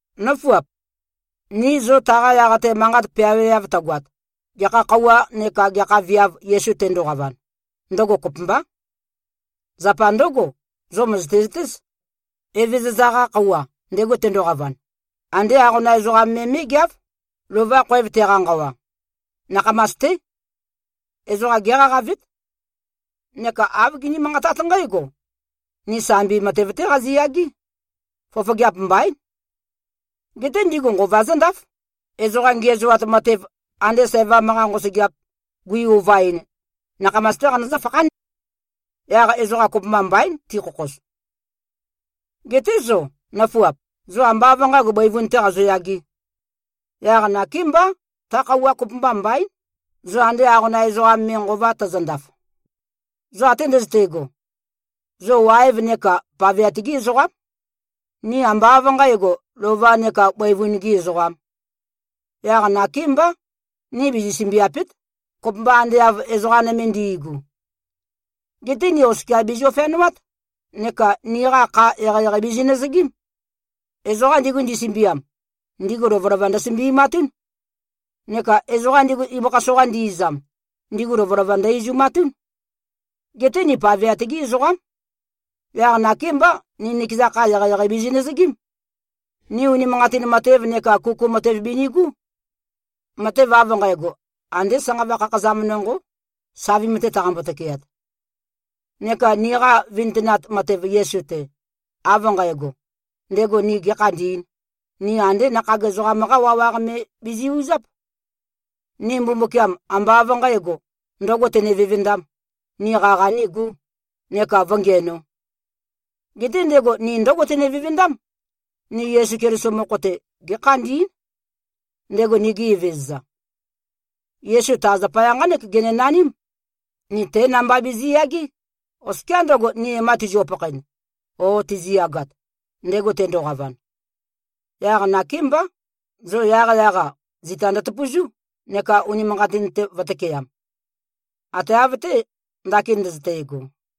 Nǿfuap! Ni zo taqa yaq-te manqat peaweav tøgoat, gekha khøuwa neka gekha viav Yesu tendoqavan, ndøgo kopømbá. Zapa ndǿgo, zo mø̀zøte-zøtéz, Evezøza-qa Khøuwa, ndego tendoqavan, andé aqonam ezoqam me mé꞉geáv, lova khoev teqa-nqawa. Nakhamas-té. Ezoqa géqaqavét. Neka āv giní-manqatát nqǽgo, “Ni sambi matev-té qaziyagé. Fofogeap mbaín.” Geté ndigu nqova zǿndáf. Ezoqa ngiæzoat matev, ande sævam-qa nqosøgeap, gui-ovaɨn, nakhamas-té qanøzǿ-fakhán. Yaq ezoqa kopømba mbaín tikhokhoz. Geté zo, nøfuap, zo ambá av nqǣgo, bøivun-tē qazoyagē. Yaq nakémbá, ta khøuwa kopømba mbaín, zo ande aqonam ezoqam me, nqova tøzøndaf. Zo ate ndøzøte꞉go, zo waev neka paveat-gí ezoqám. Ni ambá av nqǣgo, lova neka bøivun-gī ezoqām. Yaq nakémbá, ni bizi-sømbiàpe᷄t, kopømba ande av ezoqa nøme ndi꞉gu. Geté ni oskia bìzio-feanoát neka niqa kha eqeieqei bizinøzøgím. Ezoqa ndigu, ndisømbiam, ndigu lovølova ndøsømbi꞉matún. Neka ezoqa ndigu, ibøkha soqa ndi-izam, ndigu lovølova ndø-izumatún. Geté ni paveat-gí ezoqám. Yaq nakémbá, ni nikeza kha, eqeieqei bizinøzøgím. Ni unimanqatin matev neka kuku matev binigú. Matev av nqægo, andé sanqava khakhazam nonqó, savim-te taqambo-tøkeat. Neka niqa vintønat matev Yesu-te, av nqægo, ndego ni gēkhandī꞉n, ni andé nakhag ezoqam-qá wawaq me bizi꞉-uzáp. Ni Mbumbukiam, ambá av nqǣgo, ndø̄go tene-vevendām, ni qaqa nígū, neka vǿngiænō. Geté ndego ni ndǿgo tene-vevendám: Ni Yesu Keliso mokho-te gékhandí꞉n, ndego nigi Evezøza. Yesu ta zapaya nqánek genenaním: Ni té namba bizi꞉yagé, oskiá ndøgo, ni e-ma tizio-pakhaen o tiziyagat, ndego tendoqavan. Yaq nakémbá, zo yaqyaq-a, zita ndøtøpøzú neka unimanqatin-te vø̄tøkeam. Ate av-té, ndakin ndøzøte꞉go.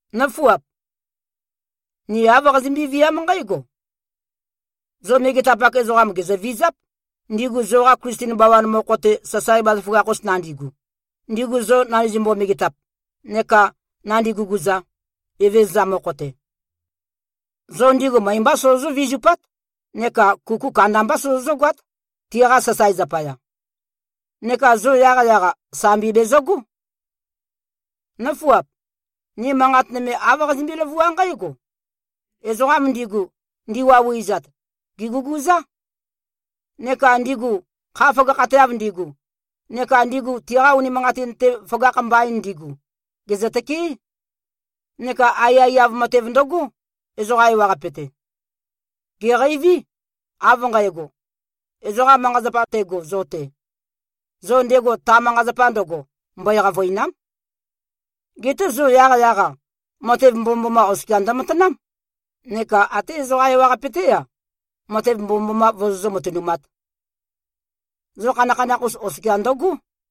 Nǿfuap! Ni āv qazimbi-viám nqǽgo: Zo megetapak ezoqam, gèzøvizáp, ndigu zoqa Klisten bawan mokho-te, sasae bazaføgakh-us nandigu, ndigu zo nandizømbo-megetap neka nandi-guguza, Evezøza mokho-te. Zo ndigu møe-mbá sozozǿ-vizupát neka kuku kandambá sozozǿ-goát, tiqa sasae zapaya. Neka zo yaqyaq-a, sambi bèzøgó. Nǿfuap! Ni manqat nøme āv qazimbí-løvuá nqǽgo: Ezoqam ndigu, ndiwauwi꞉zat, gèguguzá. Neka ndigu, kha føgakhateav ndigu, neka ndigu, tiqa unimanqatin-te føgakh mbain ndigu, gèzøtøkeé. Neka aiyaiyav matev ndøgó, ezoqa ewaqape-te. Gèqeiví, av nqægo: Ezoqa manqa-zapa tego zo-te, zo ndego ta manqa-zapa ndøgo, mbøe-qavø̀ina᷄m. Geté zo yaqyaq-a, matev mbomømboma oskia ndømatanám, neka até ezoqa ewaqape-té-a, matev mbomømboma vozó-matønumāt. Zo khanakhanakh-us oskia ndøgó.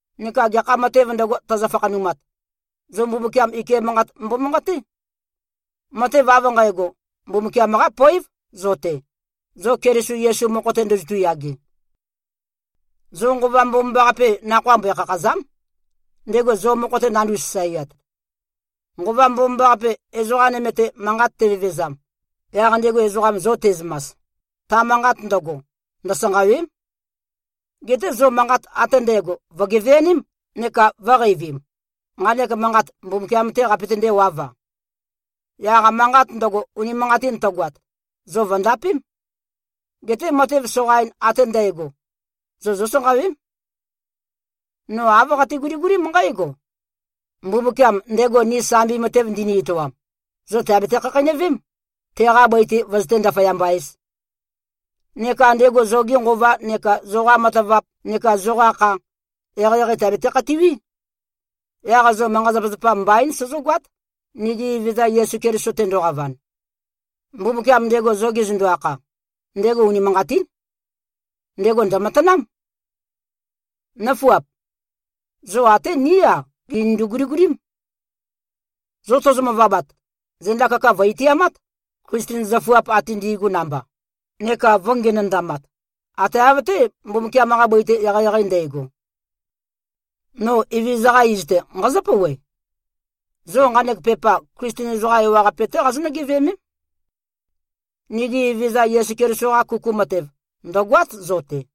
Neka gekha matēv ndøgo, tøzø-fakhanumat, zo Mbumbukiam ike manqat mbomanqaté. Matev av nqægo, Mbumbukiam-qá poév, zo-te, zo Keliso Yesu mokho-te ndozotu꞉-yage. Zo Nqova Mbomambaqape, nakhoa mbøe-khakhàza᷄m, ndego zo mokho-te nandu꞉-sasaeat. Nqova Mbomambaqape, ezoqa nøme-te manqat tevevezam, yaq ndego ezoqam zo te꞉zømas, ta manqat ndøgo, ndøsanqàwe᷄m. Geté zo manqat ate ndægo vø̀geveaném neka vø̄qeivim, nqanek manqat Mbumbukiam-tē qapøtendē-wav-a. Yaq manqat ndøgo, unimanqatin tøgoat, zo vø̀ndapém. Geté matev soqain ate ndægo, zo zósanqawém. No āv qate-guligulím nqǽgo: Mbumbukiam, ndego ni sambi matev ndini-etoam, zo tèabete-khakheinøvém, teqa bøi-te vøzøté-ndaføyamba-ēz. Neka ndego zoge nqova neka zoqa matavap neka zoqa kha, eqeieqei tèabete-khatiwí. Yaq zo manqa-zapazapa mbaín, sozógoát, nigi Evezøza Yesu Keliso tendoqavan. Mbumbukiam, ndego zo gezøndo-akha, ndego unimanqatín. Ndego ndø̀matanám. Nǿfuap! Zo até ní-a, gìnindu-guligulím. Zo tozo-møvabat, zenda kaka vø̀-itiamát, Klisten zøfuap ate ndi꞉gu namba, neka vø̄ngenøndamat, ate av-té, Mbumbukiam-qa bøi-te eqeieqei ndægo. No Evezøza-qa iz-te, nqazǿ-pouwe: Zo nqanek pepa, Klisten ezoqa ewaqape-té qazonǿ-geveømém. Nigi Evezøza Yesu Keliso-qa kuku matev, ndø̀goát, zo-te.